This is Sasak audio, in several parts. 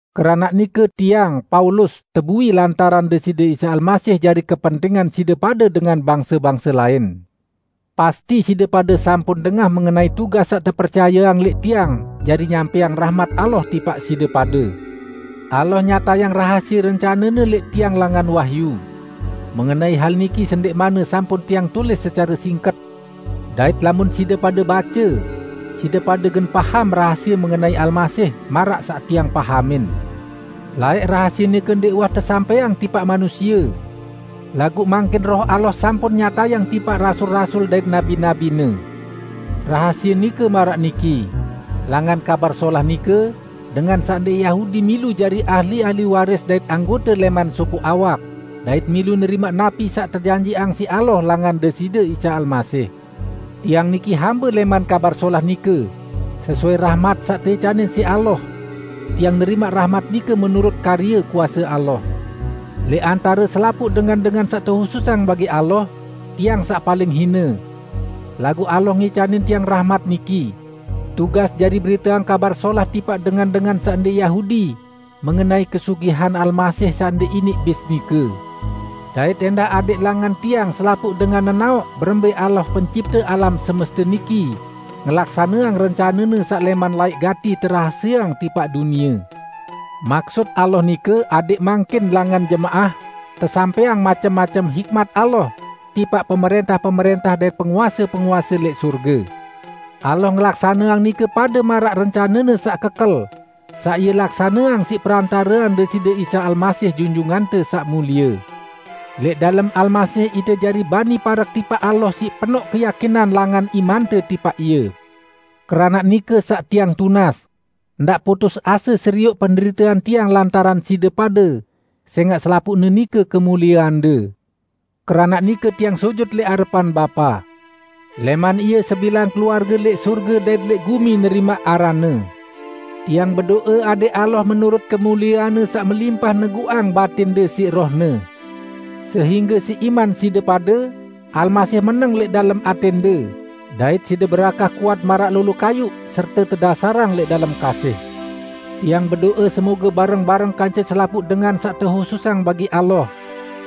Keranaq nike tiang, Paulus, tebui lantaran Deside Isa Almasih jari kepentingan side pade dengan bangse-bangse lain. Pasti side pade sampun dengah mengenai tugas saq tepercayeang lẽq tiang jari nyampẽang rahmat Allah tipaq side pade. Allah nyatayang rahasie rencane-Ne lẽq tiang langan wahyu. (Mengenai hal niki sendẽqmanne sampun tiang tulis secare singket, dait lamun side pade bace, side pade gen paham rahasie mengenai Almasih, maraq saq tiang pahamin.) Laẽq rahasie nike ndẽq uwah tesampẽang tipaq manusie, laguq mangkin Roh Allah sampun nyatayang tipaq rasul-rasul dait nabi-nabi-Ne. Rahasie nike maraq niki: Langan Kabar Solah nike, dengan saq ndẽq Yahudi milu jari ahli-ahli waris dait anggote lẽman sopoq awak, dait milu nerimaq napi saq tejanjiqang siq Allah langan Deside Isa Almasih. Tiang niki hambe lẽman Kabar Solah nike, sesuai rahmat saq teicanin siq Allah. Tiang nerimaq rahmat nike menurut karye kuase Allah. Lẽq antare selapuq dengan-dengan saq tehususang bagi Allah, tiang saq paling hine. Laguq Allah ngicanin tiang rahmat niki: Tugas jari beriteang Kabar Solah tipaq dengan-dengan saq ndẽq Yahudi mengenai kesugihan Almasih saq ndẽq iniq bis nike; dait ẽndah adẽq langan tiang selapuq dengan nenaoq berembẽ Allah, pencipte alam semeste niki, ngelaksaneang rencane-Ne saq lẽman laẽq gati terahasieang tipaq dunie. Maksut Allah nike adẽq mangkin, langan jemaah, tesampẽang macem-macem hikmat Allah tipaq pemrẽntah-pemrẽntah dait penguase-penguase lẽq sorge. Allah ngelaksaneang nike pade maraq rencane-Ne saq kekel, saq Ie laksaneang siq perantarean Deside Isa Almasih, Junjungante Saq Mulie. Lẽq dalem Almasih ite jari bani parek tipaq Allah siq penoq keyakinan langan imante tipaq Ie. Keranaq nike, saq tiang tunas: Ndaq putus ase serioq penderitean tiang lantaran side pade, sẽngaq selapuqne nike kemulieande. Keranaq nike tiang sujut lẽq arepan Bapa. Lẽman Ie sebilang keluarge lẽq sorge dait lẽq gumi nerimaq aranne. Tiang bedo'e adẽq Allah menurut kemuliean-Ne saq melimpah neguqang batinde siq Roh-Ne. Sehingge siq iman side pade, Almasih meneng lẽq dalem atẽnde, dait side berakah kuat maraq lolo kayuq dait tedasarang lẽq dalem kasih. Tiang bedo'e semoge bareng-bareng kance selapuq dengan saq tehususang bagi Allah,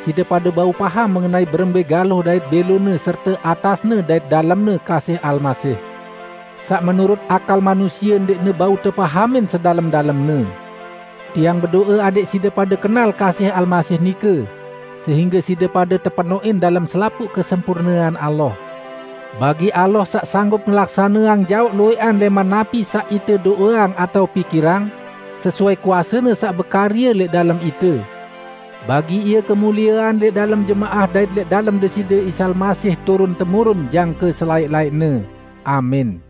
side pade bau paham mengenai berembẽ galuh dait bẽlone serte atasne dait dalemne kasih Almasih, saq menurut akal manusie ndẽqne bau tepahamin sedalem-dalemne. Tiang bedo'e adẽq side pade kenal kasih Almasih nike, sehingge side pade tepenoqin dalem selapuq kesempurnean Allah. Bagi Allah, saq sanggup ngelaksaneang jaoq luwẽqan lẽman napi saq ite do'eang atao pikirang, sesuai kuase-Ne saq bekarye lẽq dalem ite, bagi Ie kemuliean lẽq dalem jemaah dait lẽq dalem Deside Isa Almasih turun temurun jangke selaẽq-laẽqne! Amin.